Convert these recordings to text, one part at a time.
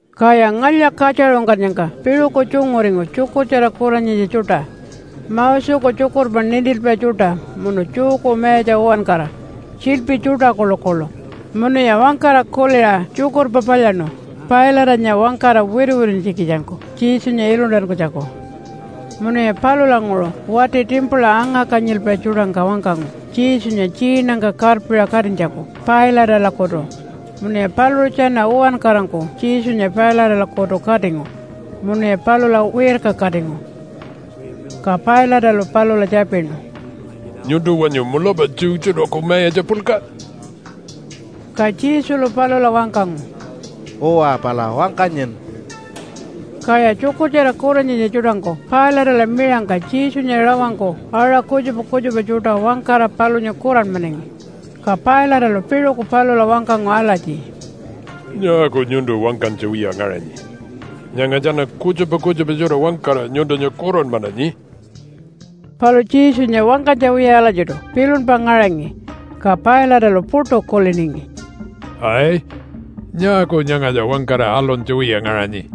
Kaya ngalya-katjaṟungkannyangka piṟuku tjunguringu tjukurtjara kuranyitja tjuṯa, Moseku tjukurpa nintilpai tjuṯa munu Jewku mayatja uwankara, tjiḻpi tjuṯa kuḻukuḻu. Munuya wangkara kuliṟa tjukurpa palyaṉu Pilate-anya wangkara wituwituntjikitjangku Jesunya iluntankunytjaku. Munuya palulanguṟu wati timpula anga-kanyilpai tjuṯangka wangkangu Jesunya tjiinangka karpiṟa katinytjaku Pilate-alakutu munuya paluṟu tjana uwankarangku Jesunya Pilate-alakutu katingu munuya palula wirkakatingu. Ka Pilate-alu palula tjapinu, “Nyuntu wanyu mulapa Jew tjuṯaku mayatja puḻka?” Ka Jesulu palula wangkangu, “Uwa, pala wangkanyin.” Kaya tjukurtjara kuranyitja tjuṯangku Pilate-ala miṟangka Jesunya rawangku aṟa kutjupa kutjupa tjuṯa wangkara palunya kuranmanangi. Ka Pilate-alu piṟuku palula wangkangu alatji, “Nyaaku nyuntu wangkanytja wiya ngaṟanyi? Nyanga tjana kutjupa kutjupa tjuṯa wangkara nyuntunya kuranmananyi.” Palu Jesunya wangkanytja wiya alatjiṯu pilunpa ngaṟangi, ka Pilate-alu puṯu kuliningi, “Ai! Nyaaku nyangatja wangkara aluntja wiya ngaṟanyi?”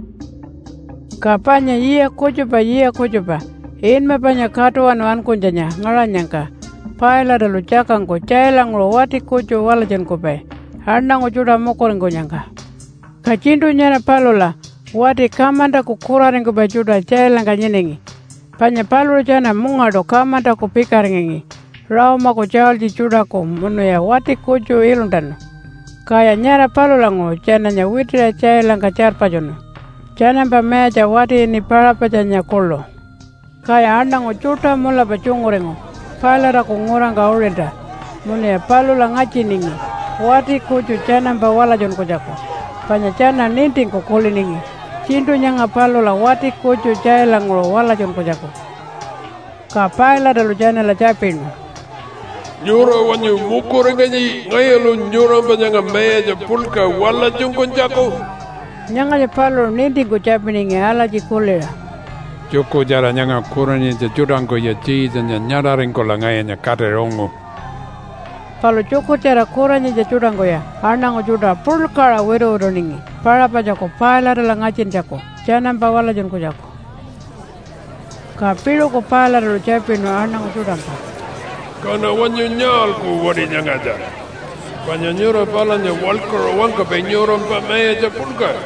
Ka panya yiya kutjupa yiya kutjupa inma panya Katuwanu Ankunytjanya ngaṟanyangka Pilate-alu tjakangku tjailanguṟu wati kutju walatjunkupai aṉangu tjuṯa mukuringkunyangka. Ka tjiṉṯu nyara palula wati kamantaku kuraringkupai tjuṯa tjailangka nyinangi. Panya paluṟu tjana mungaṯu kamantaku pikaringangi Rome-aku tjaultji tjuṯaku munuya wati kutju iluntanu, kaya nyara palulanguṟu tjananya witiṟa tjailangka tjarpatjunu tjanampa mayatja wati ini Paṟapatjanya kuḻu. Kaya aṉangu tjuṯa mulapa tjunguringu Pilate-aku ngurangka uṟilta munuya palula ngatjiningi wati kutju tjanampa walatjunkunytjaku panya tjana nintingku kuliningi tjiṉṯu nyanga palula wati kutju tjailanguṟu walatjunkunytjaku. Ka Pilate-alu tjanala tjapinu, “Nyura wanyu mukuringanyi ngayulu nyurampa nyanga mayatja puḻka walatjunkunytjaku?” Nyangatja paluṟu nintingku tjapiningi alatji kuliṟa, “Tjukurtjara nyanga kuranyitja tjuṯangkuya Jesunya nyaṟaringkula ngayunya katira ungu.” Palu tjukurtjara kuranyitja tjuṯangkuya aṉangu tjuṯa puḻkaṟa wituwituningi Paṟapatjaku Pilate-ala ngatjintjaku tjanampa walatjunkunytjaku. Ka piṟuku Pilate-alu tjapinu aṉangu tjuṯangka, “Kaṉa wanyu nyaalku wati nyangatja? Panya nyura palunya waḻkuṟa wangkapai nyurampa mayatja puḻka.”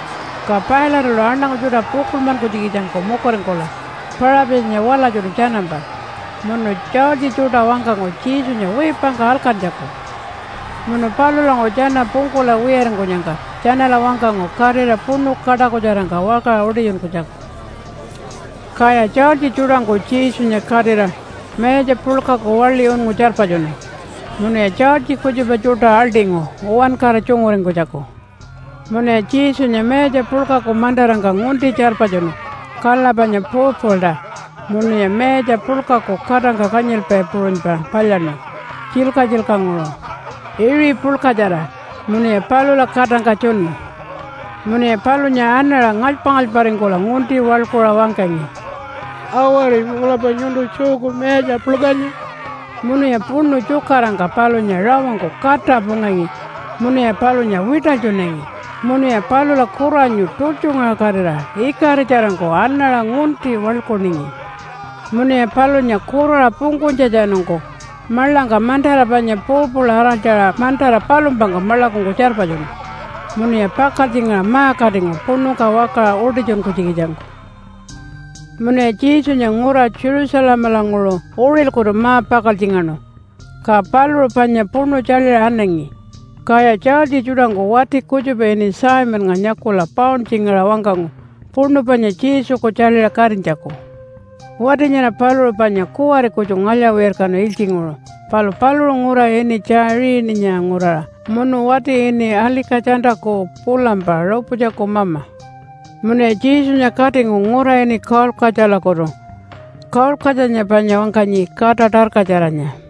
Ka Pilate-alu aṉangu tjuṯa pukuḻmankunytjikitjangku mukuringkula Paṟapatjanya walatjunu tjanampa, munu tjaultji tjuṯa wangkangu Jesunya wiipangka alkantjaku. Munu palulanguṟu tjana pungkula wiyaringkunyangka tjanala wangkangu katira puṉu kaṯakutjarangka wakaṟa utitjunkunytjaku. Kaya tjaultji tjuṯangku Jesunya katira mayatja puḻkaku waḻi unngu tjarpatjunu munuya tjaultji kutjupa tjuṯa aḻṯingu uwankara tjunguringkunytjaku. Munuya Jesunya mayatja puḻkaku mantarangka ngunti tjarpatjunu kala panya purple-ta, munuya mayatja puḻkangku katangka kanyilpai puṟunypa palyaṉu tjilka-tjilkanguṟu iṟi puḻkatjara munuya palula katangka tjunu. Munuya palunya anaṟa ngalypa-ngalyparingkula ngunti waḻkuṟa wangkangi, “Awari, mulapa nyuntu Jewku mayatja puḻkanya.” Munuya puṉu tjukarangka palunya rawangku kata pungangi, munuya palunya wiṯalytjunangi, munuya palula kuranyu tultjungaṟakatira ikaritjarangku anaṟa ngunti waḻkuningi. Munuya palunya kuraṟa pungkunytjatjanungku maḻangka mantara panya purple araltjaṟa mantara palumpangka maḻakungku tjarpatjunu, munuya pakaltjingaṟa ma-katingu puṉungka wakaṟa utitjunkunytjikitjangku. Munuya Jesunya ngura Jerusalemalanguṟu uṟilkutu ma-pakaltjingaṉu, ka paluṟu panya puṉu tjaḻiṟa anangi. Kaya tjaultji tjuṯangku wati kutjupa ini Simonnga nyakula pauntjingaṟa wangkangu puṉu panya Jesuku tjaḻiṟa katinytjaku. Wati nyara paluṟu panya kuwari kutju ngalya-wirkanu ilytjinguṟu. Palu paluṟu ngura ini Tjaiṟininya nguraṟa munu wati ini Alika-tjantaku pulampa Rupatjaku mama. Munuya Jesunya katingu ngura ini Kaulkatjalakutu. (Kaulkatjanya panya wangkanyi Kata Tarkatjaranya.)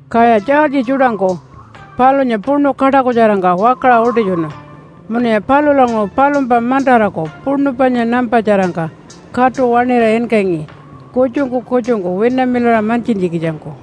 Kaya tjaultji tjuṯangku palunya puṉu kaṯakutjarangka wakaṟa utitjunu, munuya palulanguṟu palumpa mantaraku puṉu panya nampatjarangka katu waṉira inkangi kutjungku kutjungku winamilaṟa mantjintjikitjangku.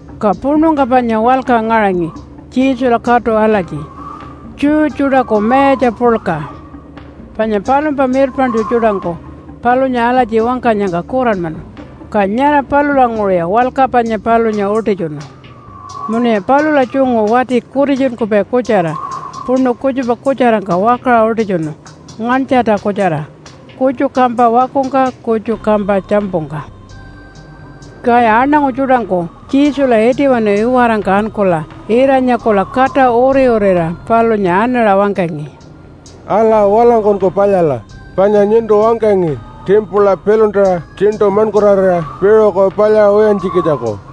Ka puṉungka panya walka ngaṟangi Jesula katu alatji, Jew Tjuṯaku Mayatja Puḻka. Panya palumpa mirpaṉtju tjuṯangku palunya alatji wangkanyangka kuranmanu, ka nyara palulanguṟuya walka panya palunya utitjunu. Munuya palula tjungu wati kutitjunkupai kutjara puṉu kutjupa kutjarangka wakaṟa utitjunu nganytjarta kutjara, kutju kampa wakungka kutju kampa tjampungka. Kaya aṉangu tjuṯangku Jesula itiwanu iwarangka ankula ira-nyakula kata uri-urira palunya anaṟa wangkangi, “Ala, walangkunku palyala, panya nyuntu wangkangi timpula piḻuntara tjiṉṯu maṉkurarira piṟuku palyaṟa wiyantjikitjangku.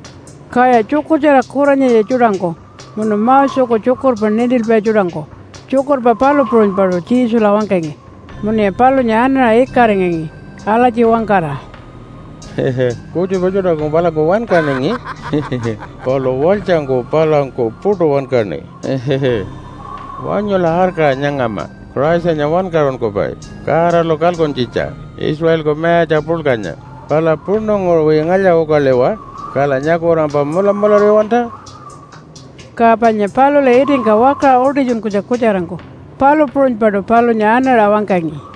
Kaya tjukurtjara kuranyitja tjuṯangku munu Moseku tjukurpa nintilpai tjuṯangku tjukurpa palu puṟunypaṯu Jesula wangkangi munuya palunya anaṟa ikaringangi alatji wangkara, “Kutjupa tjuṯa palangku wankaningi, palu walytjangku palanku puṯu wankaṉi. Wanyula arkaṟa nyangama Christanya wankaṟunkupai Godalu kalkuntjitja Israelku mayatja puḻkanya, pala puṉunguṟuwi ngalya-ukaliwa. Kala nyakulampa mulamulariwalta.” Ka panya palula itingka wakaṟa utitjunkunytja kutjarangku palu puṟunypaṯu palunya anaṟa wangkangi.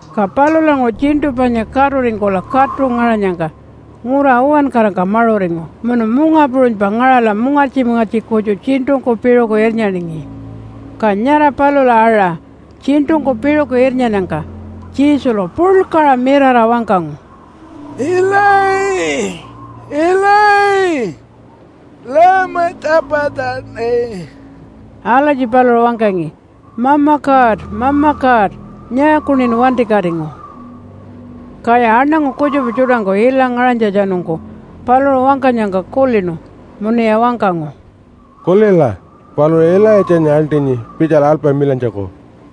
Ka palulanguṟu tjiṉṯu panya katuringkula katu ngaṟanyangka ngura uwankarangka maṟuringu munu munga puṟunypa ngaṟala mungartji-mungartji kutju tjiṉṯungku piṟuku irnyaningi. Ka nyara palula aṟa tjiṉṯungku piṟuku irnyannyangka Jesulu puḻkaṟa mirara wangkangu, “Ilayi, Ilayi, lama tjapatjani.” Alatji paluṟu wangkangi, “Mama God, Mama God! Nyaakuṉin wantikatingu?” Kaya aṉangu kutjupa tjuṯangku ilangku ngaṟanytjatjanungku paluṟu wangkanyangka kulinu munuya wangkangu, “Kulila, paluṟu Ilaitjanya aḻṯinyi pitjala alpamilantjaku.”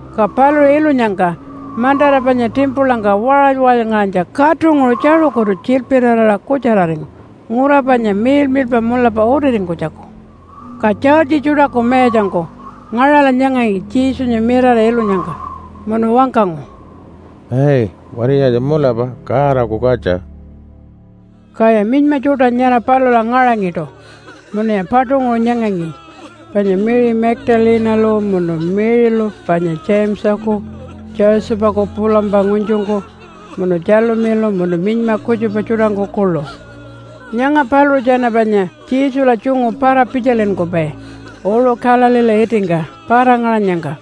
Ka paluṟu ilunyangka mantara panya timpulangka waṟaly-waṟalyngaṟanytja katunguṟu tjaṟukutu tjilpiraraṟa kutjararingu ngura panya miḻmiḻpa mulapa utiringkunytjaku. Ka tjaultji tjuṯaku mayatjangku ngaṟala nyangangi Jesunya mirara ilunyangka munu wangkangu, “Ai, wati nyangatja mulapa Godaku katja.” Kaya minyma tjuṯa nyara palula ngaṟangiṯu munuya paṯunguṟu nyangangi, panya Mary Magdalene-alu munu Mary-lu panya Jamesaku Josephaku pulampa ngunytjungku, munu Tjalumilu, munu minyma kutjupa tjuṯangku kuḻu. Nyanga paluṟu tjana panya Jesula tjungu para-pitjalinkupai uṟu Galileela itingka para-ngaṟanyangka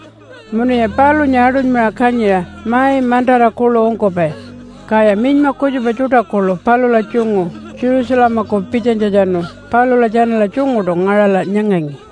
munuya palunya aṯunymaṟa kanyiṟa mai mantara kuḻu ungkupai. Kaya minyma kutjupa tjuṯa kuḻu palula tjungu Jerusalemaku pitjanytjatjanu palula tjanala tjunguṯu ngaṟala nyangangi.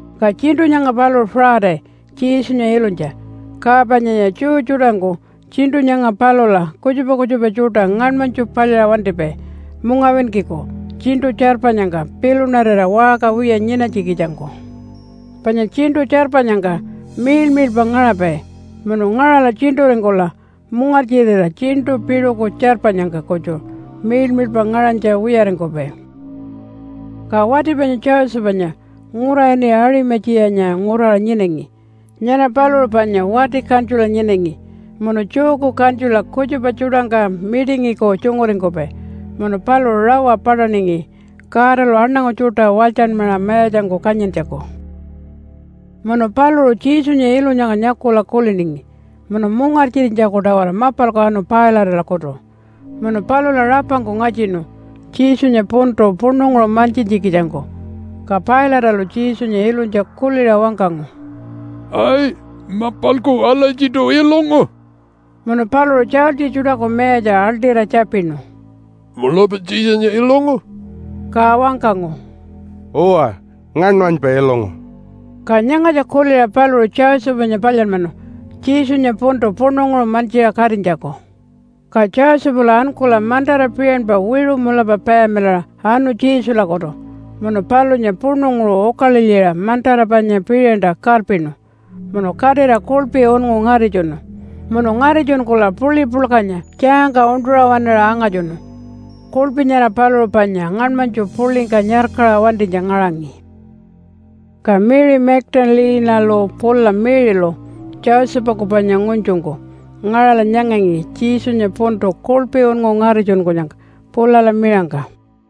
Ka tjiṉṯu nyanga paluṟu Friday Jesunya ilunytja, ka panyaya Jew tjuṯangku tjiṉṯu nyanga palula kutjupa kutjupa tjuṯa ngaṉmanytju palyaṟa wantipai mungawinkiku tjiṉṯu tjarpanyangka pilunarira waṟka wiya nyinanytjikitjangku. Panya tjiṉṯu tjarpanyangka miḻmiḻpa ngaṟapai munu ngaṟala tjiṉṯuringkula mungartjirira tjiṉṯu piṟuku tjarpanyangka kutju miḻmiḻpa ngaṟanytja wiyaringkupai. Ka wati panya Josephanya ngura ini Aṟima-tjiyanya nguraṟa nyinangi. Nyara paluṟu panya wati kantjula nyinangi munu Jewku kantjula kutjupa tjuṯangka mitingiku tjunguringkupai. Munu paluṟu rawa paṯaningi Godalu aṉangu tjuṯa walytjanmaṟa mayatjangku kanyintjaku. Munu paluṟu Jesunya ilunyangka nyakula kuliningi munu mungartjirinytjaku-tawara mapalku anu Pilate-alakutu munu palula rapangku ngatjinu Jesunya puntu puṉunguṟu mantjintjikitjangku. Ka Pilate-alu Jesunya ilunytja kuliṟa wangkangu, “Ai, mapalku alatjiṯu ilungu?” Munu paluṟu tjaultji tjuṯaku mayatja aḻṯira tjapinu, “Mulapa Jesunya ilungu?” Ka wangkangu, “Uwa, ngaṉmanypa ilungu.” Ka nyangatja kuliṟa paluṟu Josephanya palyanmanu Jesunya puntu puṉunguṟu mantjiṟa katinytjaku. Ka Josephalu ankula mantara piṟanpa wiṟu mulapa payamilaṟa anu Jesulakutu munu palunya puṉunguṟu ukalilyiṟa mantara panya piṟanta karpinu munu katira kuḻpi unngu ngaritjunu. Munu ngaritjunkula puḻi puḻkanya tjaangka uṉṯuṟa waṉaṟa angatjunu. Kuḻpi nyara paluṟu panya ngaṉmanytju puḻingka nyarkaṟa wantinytja ngaṟangi. Ka Mary Magdalene-alu pula Mary-lu, Josephaku panya ngunytjungku, ngaṟala nyangangi Jesunya puntu kuḻpi unngu ngaritjunkunyangka pulala miṟangka.